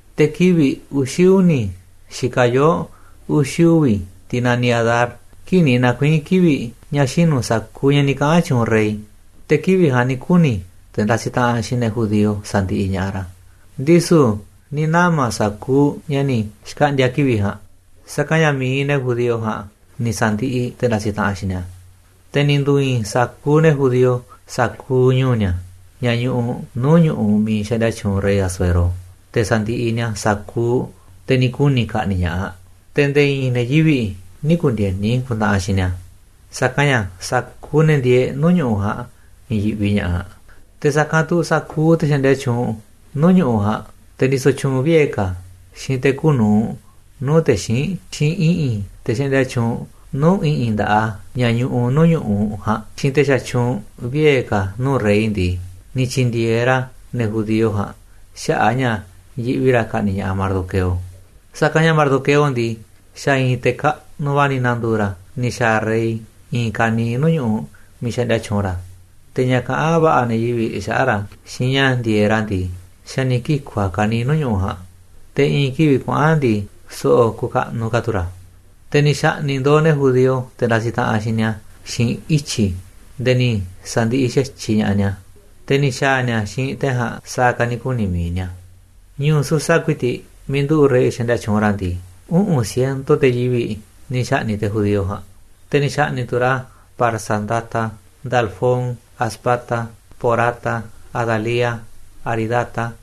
Te̱ kivi̱ꞌ uxi̱ uni̱ xikaꞌ yoo̱ uxi̱ uvi̱, tiꞌ naniꞌ Adar, kii̱ꞌ ni̱ na̱kuii̱n kivi̱ꞌ ña̱ xinu̱ sa̱kuuꞌ ña̱ ni̱ kaꞌa̱n tyuunꞌ rey, te̱ kivi̱ꞌ ja̱a̱nꞌ ni̱ kuni̱ te̱ ndasiꞌ taꞌanꞌ xiinꞌ ne̱ judío sa̱ndiꞌiꞌ ña̱ꞌaꞌ ra̱, ndisu̱ ni̱ nama̱ sa̱kuuꞌ ña̱ ni̱ xkaꞌndi̱a̱ kivi̱ꞌ ja̱a̱nꞌ, sa̱kanꞌ ña̱ mi̱iꞌ ne̱ judío ja̱a̱nꞌ ni̱ sa̱ndiꞌiꞌ te̱ ndasiꞌ taꞌanꞌ xiinꞌ ni̱a̱. Te̱ ni̱ ndu̱i̱i̱n sa̱kuuꞌ ne̱ judío sa̱kuuꞌ ñu̱u̱ ni̱a̱, ña̱ ñuꞌuꞌ nuu̱ꞌ ñu̱ꞌuꞌ miiꞌ xaꞌndia tyuunꞌ rey Asuero, te̱ sa̱ndiꞌiꞌ ni̱a̱ sa̱kuuꞌ te̱ ni̱ kuni̱ ka̱ꞌni̱ꞌ ña̱ꞌaꞌ. Te̱ nde̱e̱ i̱i̱n ne̱ yivi̱ꞌ nï̱ ku̱ndi̱e̱ni ku̱ntaꞌanꞌ xiinꞌ ni̱a̱, sa̱kanꞌ ña̱ sa̱kuuꞌ ne̱ ndieeꞌ nuu̱ꞌ ñu̱ꞌuꞌ ja̱a̱nꞌ ni̱ yi̱ꞌvi ña̱ꞌaꞌ. Te̱ sa̱kanꞌ tu̱ sa̱kuuꞌ te̱ xaꞌndia tyuunꞌ nuu̱ꞌ ñu̱ꞌuꞌ ja̱a̱nꞌ, te̱ ndisoꞌ tyuunꞌ vie̱ ka̱ xiinꞌ te̱ kuuꞌ nu̱uꞌ nuu̱ꞌ te̱ xíinꞌ, xiinꞌ i̱ꞌi̱n te̱ xaꞌndia tyuunꞌ nuu̱ꞌ i̱ꞌi̱n nda̱ꞌaꞌ a̱ ña̱ ñuꞌuꞌ nuu̱ꞌ ñu̱ꞌuꞌ ja̱a̱nꞌ, xiinꞌ te̱ xatyuunꞌ vie̱ ka̱ nuu̱ꞌ rey ndii, ni̱ tyi̱ndi̱e̱eꞌ ra̱ ne̱ judío ja̱a̱nꞌ xaꞌa̱ꞌ a̱ ña̱ yiꞌvi ra̱ ka̱ꞌni̱ꞌ ña̱ꞌaꞌ Mardoqueo. Sa̱kanꞌ ña̱ Mardoqueo ndii, xa̱ i̱i̱n te̱ kaꞌnuꞌ va̱ ni̱ na̱ndu̱u̱ ra̱ ni̱ xa̱a̱ rey i̱i̱n ka̱niiꞌ nuu̱ꞌ ñu̱ꞌuꞌ miiꞌ xaꞌndia tyuunꞌ ra̱. Te̱ ña̱ kaꞌán va̱ꞌa̱ ne̱ yivi̱ꞌ xaꞌa̱ꞌ ra̱ xiinꞌ ña̱ ndi̱e̱eꞌ ra̱ ndii, xa̱ ni̱ kiku̱ a̱ ka̱niiꞌ nuu̱ꞌ ñu̱ꞌuꞌ ja̱a̱nꞌ, te̱ i̱ꞌi̱n kivi̱ꞌ kuaꞌa̱n ndii, so̱ꞌo̱ kukaꞌnuꞌ ka̱ tu̱ ra̱. Te̱ ni̱ xa̱ꞌni̱ꞌ ndo̱o̱ ne̱ judío te̱ ndasiꞌ taꞌanꞌ xiinꞌ ni̱a̱ xiinꞌ ityi̱ nde̱e̱ ni̱ sa̱ndiꞌiꞌ xa̱tyiꞌ ña̱ꞌaꞌ ni̱a̱, te̱ ni̱ xa̱a̱ ni̱a̱ xiinꞌ te̱ ja̱a̱nꞌ sa̱a̱ ka̱ ni̱ kuni̱ mi̱iꞌ ni̱a̱. Ñu̱u̱ Susa ku̱i̱ti̱ꞌ, miiꞌ nduꞌu̱ꞌ rey xaꞌndia tyuunꞌ ra̱ ndii, uꞌu̱n ciento te̱ yivi̱ꞌ ni̱ xa̱ꞌni̱ꞌ te̱ judío ja̱a̱nꞌ. Te̱ ni̱ xa̱ꞌni̱ꞌ tu̱ ra̱ Parsandata, Dalfón, Aspata, Porata, Adalía, Aridata,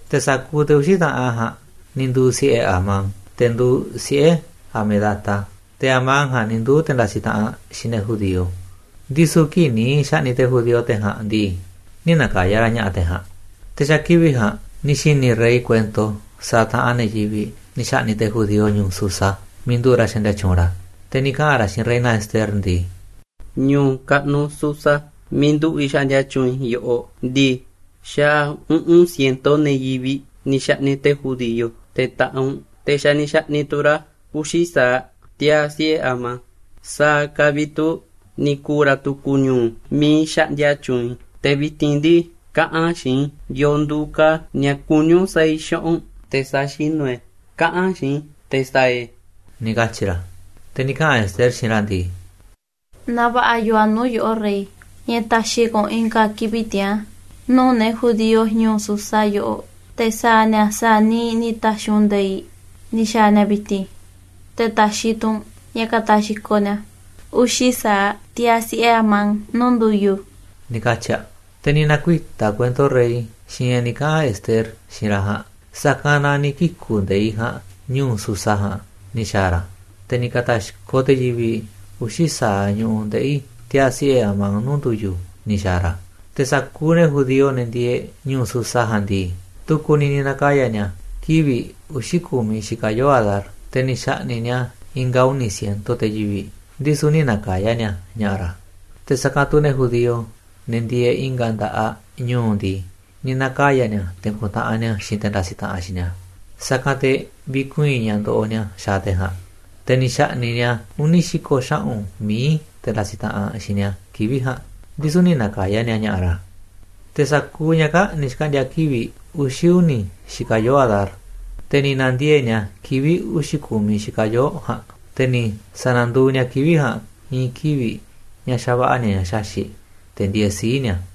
Te̱ sa̱kuuꞌ te̱ uxi̱ taꞌanꞌ ja̱a̱nꞌ ni̱ nduu̱ siꞌe̱ Amán, te̱ nduuꞌ siꞌe̱ Hamedata. Te̱ Amán ja̱a̱nꞌ ni̱ nduu̱ te̱ ndasiꞌ taꞌanꞌ xiinꞌ ne̱ judío. Ndisu̱ kii̱ꞌ ni̱ xa̱ꞌni̱ꞌ te̱ judío te̱ ja̱a̱nꞌ ndii, nï̱ na̱ka̱ya̱ ra̱ ña̱ꞌa̱ te̱ ja̱a̱nꞌ. Te̱ xa̱ kivi̱ꞌ ja̱a̱nꞌ ni̱ xi̱ni̱ rey kuento sa̱a̱ taꞌanꞌ ne̱ yivi̱ꞌ ni̱ xa̱ꞌni̱ꞌ te̱ judío ñu̱u̱ Susa miiꞌ nduꞌu̱ꞌ ra̱ xaꞌndia tyuunꞌ ra̱. Te̱ ni̱ kaꞌa̱n ra̱ xiinꞌ reina Ester ndii: ―Ñu̱u̱ kaꞌnuꞌ Susa miiꞌ nduꞌu̱ꞌ i̱ xaꞌndia tyuunꞌ i̱ yoꞌoꞌ ndii, xa̱ uꞌu̱n ciento ne̱ yivi̱ꞌ ni̱ xa̱ꞌni̱ꞌ te̱ judío, te̱ taꞌanꞌ u̱nꞌ, te̱ xa̱ ni̱ xa̱ꞌni̱ꞌ tu̱ ra̱ uxi̱ sa̱aꞌ tiaa̱ siꞌe̱ Amán. ¿Sa̱a̱ ka̱ vi̱ꞌ tu̱ ni̱ ku̱u̱ ra̱ tu̱ku̱ ñu̱u̱ miiꞌ xaꞌndia tyuunꞌ i̱? Te̱ vi̱ti̱n ndii, kaꞌa̱n xiinꞌ i̱ yo̱o̱ nduuꞌ ka̱ ña̱ kuní u̱nꞌ sa̱a̱ i̱ xaꞌa̱ꞌ u̱nꞌ, te̱ sa̱xinu̱ i̱ e̱. Kaꞌa̱n xiinꞌ i̱ te̱ sa̱a̱ i̱ e̱ ―ni̱ katyi̱ ra̱. Te̱ ni̱ kaꞌa̱n Ester xiinꞌ ra̱ ndii: ―Naaꞌ va̱ꞌa̱ yoo a̱ nuu̱ꞌ yoꞌó, rey, ña̱ ta̱xi̱ ka̱ u̱nꞌ i̱nga̱ kivi̱ꞌ tiaa̱n nuu̱ꞌ ne̱ judío ñu̱u̱ Susa yoꞌoꞌ, te̱ sa̱a̱ ni̱a̱ sa̱a̱ niiꞌ ni̱ ta̱xi̱ u̱nꞌ nde̱iꞌ ni̱ xa̱a̱ ni̱a̱ vi̱ti̱n, te̱ ta̱xi̱ tu̱ u̱nꞌ ña̱ ka̱ta̱xkoꞌ ni̱a̱ uxi̱ sa̱aꞌ tiaa̱ siꞌe̱ Amán nuu̱ꞌ ndu̱yu̱ ―ni̱ katyi̱ aꞌ. Te̱ ni̱ na̱kuita̱ kuento rey xiinꞌ ña̱ ni̱ kaꞌa̱n Ester xiinꞌ ra̱ ja̱a̱nꞌ. Sa̱kanꞌ na ni̱ kiku̱ nde̱iꞌ ja̱a̱nꞌ ñu̱u̱ Susa ja̱a̱nꞌ ni̱ xa̱a̱ ra̱, te̱ ni̱ ka̱ta̱xkoꞌ te̱ yivi̱ꞌ uxi̱ sa̱aꞌ ñu̱ꞌuꞌ ndeꞌi̱ tiaa̱ siꞌe̱ Amán nuu̱ꞌ ndu̱yu̱ ni̱ xa̱a̱ ra̱. Te̱ sa̱kuuꞌ ne̱ judío, ne̱ ndieeꞌ ñu̱u̱ Susa ja̱a̱nꞌ ndii, tu̱ku̱ ni̱ ni̱ na̱ka̱ya̱ ni̱a̱ kivi̱ꞌ uxi̱ ku̱miꞌ xikaꞌ yoo̱ꞌ Adar, te̱ ni̱ xa̱ꞌni̱ꞌ ni̱a̱ i̱nga̱ uni̱ ciento te̱ yivi̱ꞌ, ndisu̱ nï̱ na̱ka̱ya̱ ni̱a̱ ña̱ꞌa̱ ra̱. Te̱ sa̱kanꞌ tu̱ ne̱ judío, ne̱ ndieeꞌ i̱nga̱ nda̱ꞌaꞌ ñu̱u̱ ndii, ni̱ na̱kaya̱ ni̱a̱ te̱ ku̱ntaꞌanꞌ ni̱a̱ xiinꞌ te̱ ndasiꞌ taꞌanꞌ xiinꞌ ni̱a̱, sa̱kanꞌ te̱ vi̱kuii̱n ña̱ ndoꞌoꞌ ni̱a̱ xaaꞌ te̱ ja̱a̱nꞌ. Te̱ ni̱ xa̱ꞌni̱ꞌ ni̱a̱ uni̱ xi̱ko̱ xaꞌu̱n mií te̱ ndasiꞌ taꞌanꞌ xiinꞌ ni̱a̱ kivi̱ꞌ ja̱a̱nꞌ, ndisu̱ nï̱ na̱ka̱ya̱ ni̱a̱ ña̱ꞌa̱ ra̱. Te̱ sa̱kuuꞌ ña̱ kaa̱ꞌ ni̱ xkaꞌndi̱a̱ kivi̱ꞌ uxi̱ uni̱ xikaꞌ yoo̱ꞌ Adar, te̱ ni̱ na̱ndiee̱ꞌ ni̱a̱ kivi̱ꞌ uxi̱ ku̱miꞌ xikaꞌ yoo̱ꞌ ja̱a̱nꞌ. Te̱ ni̱ sa̱na̱nduuꞌ ni̱a̱ kivi̱ꞌ ja̱a̱nꞌ i̱i̱n kivi̱ꞌ ña̱ xava̱ꞌa̱ ni̱a̱ ña̱ xaxi̱ꞌ, te̱ ndieeꞌ sii̱ꞌ ni̱a̱.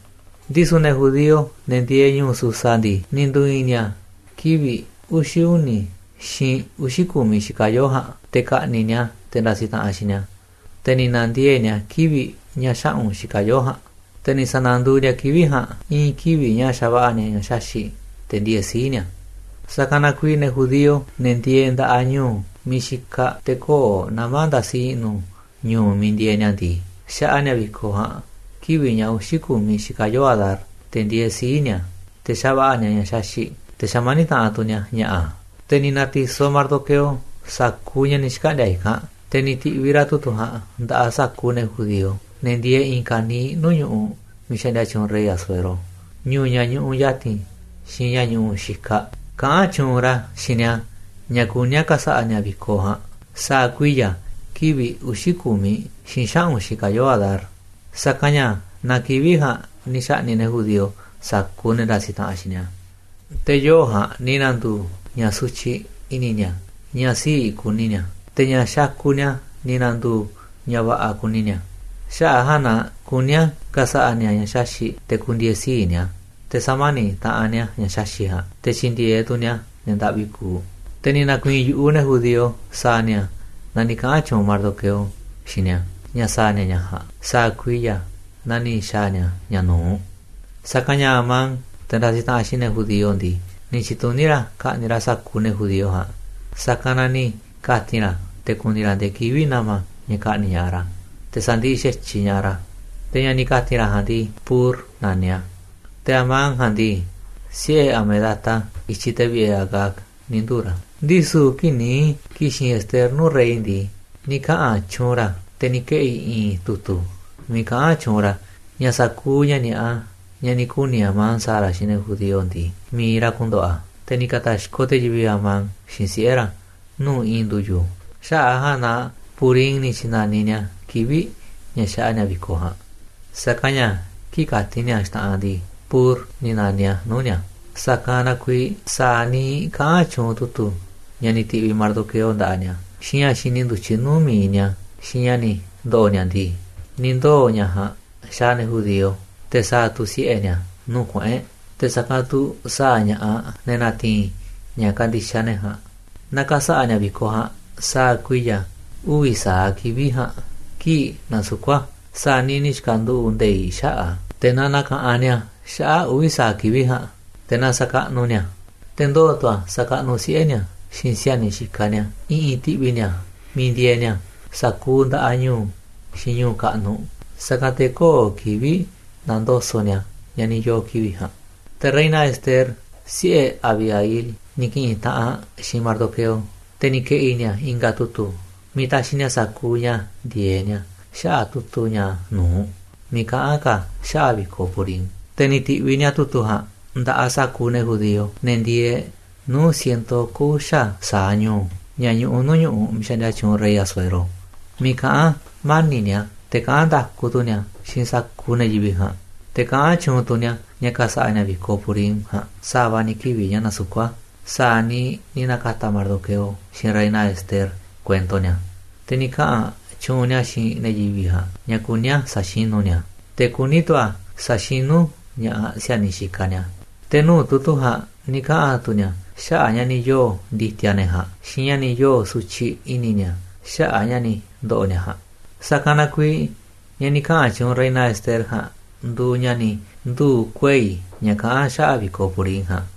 Ndisu̱ ne̱ judío, ne̱ ndieeꞌ ñu̱u̱ Susa ndii, ni̱ ndu̱i̱i̱n ni̱a̱ kivi̱ꞌ uxi̱ uni̱ xiinꞌ uxi̱ ku̱miꞌ xikaꞌ yoo̱ꞌ ja̱a̱nꞌ te̱ ka̱ꞌni̱ꞌ ni̱a̱ te̱ ndasiꞌ taꞌanꞌ xiinꞌ ni̱a̱. Te̱ ni̱ na̱ndiee̱ꞌ ni̱a̱ kivi̱ꞌ ña̱ xaꞌu̱n xikaꞌ yoo̱ꞌ ja̱a̱nꞌ, te̱ ni̱ sa̱na̱nduuꞌ ni̱a̱ kivi̱ꞌ ja̱a̱nꞌ i̱i̱n kivi̱ꞌ ña̱ xava̱ꞌa̱ ni̱a̱ ña̱ xaxi̱ꞌ te̱ ndieeꞌ sii̱ꞌ ni̱a̱. Sa̱kanꞌ na kuiiꞌ ne̱ judío, ne̱ ndieeꞌ nda̱ꞌaꞌ ñu̱u̱ miiꞌ xikaꞌ te̱ köo̱ꞌ nama̱ ndasi i̱ꞌnu̱ ñu̱u̱ miiꞌ ndieeꞌ ni̱a̱ ndii, xaꞌa ni̱a̱ vi̱koꞌ ja̱a̱nꞌ kivi̱ꞌ ña̱ uxi̱ ku̱miꞌ xikaꞌ yoo̱ꞌ Adar, te̱ ndieeꞌ sii̱ꞌ ni̱a̱, te̱ xava̱ꞌa̱ ni̱a̱ ña̱ xaxi̱ꞌ, te̱ xamaníꞌ taꞌanꞌ tu̱ ni̱a̱ ña̱ꞌa̱. Te̱ ni̱ na̱ti̱soꞌ Mardoqueo sa̱kuuꞌ ña̱ ni̱ xkaꞌndi̱a̱ i̱kanꞌ, te̱ ni̱ ti̱ꞌviꞌ ra̱ tu̱tu̱ ja̱a̱nꞌ nda̱ꞌaꞌ sa̱kuuꞌ ne̱ judío, ne̱ ndieeꞌ i̱i̱n ka̱niiꞌ nuu̱ꞌ ñu̱ꞌuꞌ miiꞌ xaꞌndia tyuunꞌ rey Asuero, ñu̱u̱ ña̱ ñuꞌuꞌ ya̱ti̱n xiinꞌ ña̱ ñuꞌuꞌ xikaꞌ, kaꞌán tyuunꞌ ra̱ xiinꞌ ni̱a̱ ña̱ kuní a̱ ka̱sa̱ꞌa̱ ni̱a̱ vi̱koꞌ ja̱a̱nꞌ sa̱a̱ kuiya̱ kivi̱ꞌ uxi̱ ku̱miꞌ xiinꞌ xaꞌu̱n xikaꞌ yoo̱ꞌ Adar. Sa̱kanꞌ ña̱ naa kivi̱ꞌ ja̱a̱nꞌ ni̱ xa̱ꞌni̱ꞌ ne̱ judío sa̱kuuꞌ ne̱ ndasiꞌ taꞌanꞌ xiinꞌ ni̱a̱. Te̱ yoo̱ꞌ ja̱a̱nꞌ ni̱ na̱ndu̱u̱ ña̱ sutyiꞌ i̱ni̱ ni̱a̱, ña̱ sii̱ꞌ kuni ni̱a̱, te̱ ña̱ xakuꞌ ni̱a̱ ni̱ na̱ndu̱u̱ ña̱ va̱ꞌa̱ kuni ni̱a̱. Xaꞌa̱ꞌ a̱ ja̱a̱nꞌ na kuní a̱ ka̱sa̱ꞌa̱ ni̱a̱ ña̱ xaxi̱ꞌ te̱ ku̱ndi̱e̱e̱ sii̱ꞌ ni̱a̱, te̱ sa̱mani̱ꞌ taꞌanꞌ ni̱a̱ ña̱ xaxi̱ꞌ ja̱a̱nꞌ, te̱ tyi̱ndi̱e̱eꞌ tu̱ ni̱a̱ ne̱ ndaꞌvi kuuꞌ. Te̱ ni̱ na̱ku̱i̱i̱n yu̱ꞌuꞌ ne̱ judío sa̱a̱ ni̱a̱ naa ni̱ kaꞌa̱n tyuunꞌ Mardoqueo xiinꞌ ni̱a̱ ña̱ sa̱a̱ ni̱a̱ ña̱ ja̱a̱nꞌ sa̱a̱ kuiya̱, naa ni̱ xa̱a̱ ni̱a̱ ña̱ nu̱uꞌ. Sa̱kanꞌ ña̱ Amán, te̱ ndasiꞌ taꞌanꞌ xiinꞌ ne̱ judío ndii, ni̱ tyi̱tuní ra̱ ka̱ꞌni̱ꞌ ra̱ sa̱kuuꞌ ne̱ judío ja̱a̱nꞌ, sa̱kanꞌ na ni̱ ka̱ti̱n ra̱ te̱ ku̱ni̱ ra̱ ndee kivi̱ꞌ na̱ma̱ ña̱ ka̱ꞌni̱ꞌ ña̱ꞌaꞌ ra̱, te̱ sa̱ndiꞌiꞌ xa̱tyiꞌ ña̱ꞌaꞌ ra̱. Te̱ ña̱ ni̱ ka̱ti̱n ra̱ ja̱a̱nꞌ ndii, pur naniꞌ a̱. Te̱ Amán ja̱a̱nꞌ ndii, siꞌe̱ Hamedata, i̱tyiꞌ te̱ vi̱ꞌe̱ Agag, ni̱ nduu̱ ra̱. Ndisu̱ kii̱ꞌ ni̱ ki̱xi̱n Ester nuu̱ꞌ rey ndii, ni̱ kaꞌa̱n tyuunꞌ ra̱, te̱ ni̱ keꞌi̱ i̱i̱n tu̱tu̱ miiꞌ kaꞌán tyuunꞌ ra̱ ña̱ sa̱kuuꞌ ña̱ ni̱a̱ꞌa, ña̱ ni̱ kuni̱ Amán sa̱a̱ ra̱ xiinꞌ ne̱ judío ndii, mi̱iꞌ ra̱ ku̱ndo̱ꞌo̱ a̱. Te̱ ni̱ ka̱ta̱xkoꞌ te̱ yivi̱ꞌ Amán xiinꞌ siꞌe̱ ra̱ nuu̱ꞌ i̱i̱n ndu̱yu̱. Xaꞌa̱ꞌ a̱ ja̱a̱nꞌ na Purim ni̱ tyi̱na̱niꞌ ni̱a̱ kivi̱ꞌ ña̱ xaꞌa ni̱a̱ vi̱koꞌ ja̱a̱nꞌ, sa̱kanꞌ ña̱ kii̱ꞌ kati̱n ni̱a̱ xta̱ꞌanꞌ ndii, Pur ni̱ na̱niꞌ a̱ nuu̱ꞌ ni̱a̱. Sa̱kanꞌ na kuiiꞌ sa̱a̱ niiꞌ kaꞌán tyuunꞌ tu̱tu̱ ña̱ ni̱ ti̱ꞌviꞌ Mardoqueo nda̱ꞌaꞌ ni̱a̱, xiinꞌ ña̱ xi̱ni̱ ndu̱tyiꞌ nuu̱ꞌ mi̱iꞌ ni̱a̱, xiinꞌ ña̱ ni̱ ndo̱ꞌo̱ ni̱a̱ ndii, ni̱ ndoo̱ ña̱ ja̱a̱nꞌ xaaꞌ ne̱ judío, te̱ sa̱a̱ tu̱ siꞌe̱ ni̱a̱ nuu̱ꞌ kuꞌu̱n e̱ꞌ, te̱ sa̱kanꞌ tu̱ sa̱a̱ ña̱ꞌaꞌ ne̱ na̱ti̱i̱n ña̱ kandixaꞌ ne̱ ja̱a̱nꞌ. Na ka̱sa̱ꞌa̱ ni̱a̱ vi̱koꞌ ja̱a̱nꞌ sa̱a̱ kuiya̱ uvi̱ sa̱aꞌ kivi̱ꞌ ja̱a̱nꞌ kii̱ꞌ nasukú a̱, sa̱a̱ niiꞌ ni̱ xka̱nduꞌu̱ꞌ nde̱iꞌ xaꞌa̱ꞌ a̱. Te̱ na na̱ka̱ꞌanꞌ ni̱a̱ xaꞌa̱ꞌ uvi̱ sa̱aꞌ kivi̱ꞌ ja̱a̱nꞌ, te̱ na sa̱kaꞌnuꞌ ni̱a̱ a̱, te̱ ndoo̱ tu̱ a̱ sa̱kaꞌnuꞌ siꞌe̱ ni̱a̱, xiinꞌ si̱a̱niꞌ xikaꞌ ni̱a̱, i̱ꞌi̱n ti̱ꞌvi̱ ni̱a̱ miiꞌ ndieeꞌ ni̱a̱, sa̱kuuꞌ nda̱ꞌaꞌ ñu̱u̱, xiinꞌ ñu̱u̱ kaꞌnuꞌ. Sa̱kanꞌ te̱ köo̱ꞌ kivi̱ꞌ na̱ndoso̱ꞌ ni̱a̱ ña̱ ni̱ yoo̱ kivi̱ꞌ ja̱a̱nꞌ. Te̱ reina Ester, siꞌe̱ Abihail, ni̱ ki̱ꞌi̱n taꞌanꞌ aꞌ xiinꞌ Mardoqueo, te̱ ni̱ ke̱ꞌi̱ ni̱a̱ i̱nga̱ tu̱tu̱ miiꞌ taxiꞌ ni̱a̱ sa̱kuuꞌ ña̱ ndi̱e̱eꞌ ni̱a̱ xaꞌa̱ꞌ tu̱tu̱ ña̱ nu̱uꞌ miiꞌ kaꞌán ka̱ a̱ xaꞌa̱ꞌ vi̱koꞌ Purim. Te̱ ni̱ ti̱ꞌviꞌ ni̱a̱ tu̱tu̱ ja̱a̱nꞌ nda̱ꞌaꞌ sa̱kuuꞌ ne̱ judío, ne̱ ndieeꞌ nuu̱ꞌ ciento oko̱ uxa̱ sa̱aꞌ ñu̱u̱ ña̱ ñuꞌuꞌ nuu̱ꞌ ñu̱ꞌuꞌ miiꞌ xaꞌndia tyuunꞌ rey Asuero, miiꞌ kaꞌán mani̱ꞌ ni̱a̱, te̱ kaꞌán nda̱ku tu̱ ni̱a̱ xiinꞌ sa̱kuuꞌ ne̱ yivi̱ꞌ ja̱a̱nꞌ. Te̱ kaꞌán tyuunꞌ tu̱ ni̱a̱ ña̱ ka̱sa̱ꞌa̱ ni̱a̱ vi̱koꞌ Purim ja̱a̱nꞌ sa̱va̱ ni̱ kivi̱ꞌ ña̱ nasukú a̱, sa̱a̱ niiꞌ ni̱ na̱ka̱ta̱ Mardoqueo xiinꞌ reina Ester kuento ni̱a̱. Te̱ ni̱ kaꞌa̱n tyuunꞌ ni̱a̱ xiinꞌ ne̱ yivi̱ꞌ ja̱a̱nꞌ ña̱ kuní a̱ sa̱xinú ni̱a̱ a̱, te̱ kuní tu̱ a̱ sa̱xinú ña̱ꞌaꞌ si̱a̱niꞌ xikaꞌ ni̱a̱. Te̱ nuu̱ꞌ tu̱tu̱ ja̱a̱nꞌ ni̱ kaꞌa̱n tu̱ ni̱a̱ xaꞌa̱ꞌ ña̱ ni̱ yoo̱ ndi̱ti̱a̱ ne̱ ja̱a̱nꞌ xiinꞌ ña̱ ni̱ yoo̱ sutyiꞌ i̱ni̱ ni̱a̱ xaꞌa̱ꞌ ña̱ ni̱ ndo̱ꞌo̱ ni̱a̱ ja̱a̱nꞌ. Sa̱kanꞌ na kuiiꞌ ña̱ ni̱ kaꞌa̱n tyuunꞌ reina Ester ja̱a̱nꞌ nduuꞌ ña̱ ni̱ nduu̱ kuei̱ ña̱ kaꞌán xaꞌa̱ꞌ vi̱koꞌ Purim ja̱a̱nꞌ,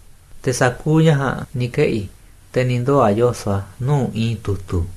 te̱ sa̱kuuꞌ ña̱ ja̱a̱nꞌ ni̱ keꞌi̱, te̱ ni̱ ndoo̱ a̱ yoso̱ꞌ a̱ nuu̱ꞌ i̱i̱n tu̱tu̱.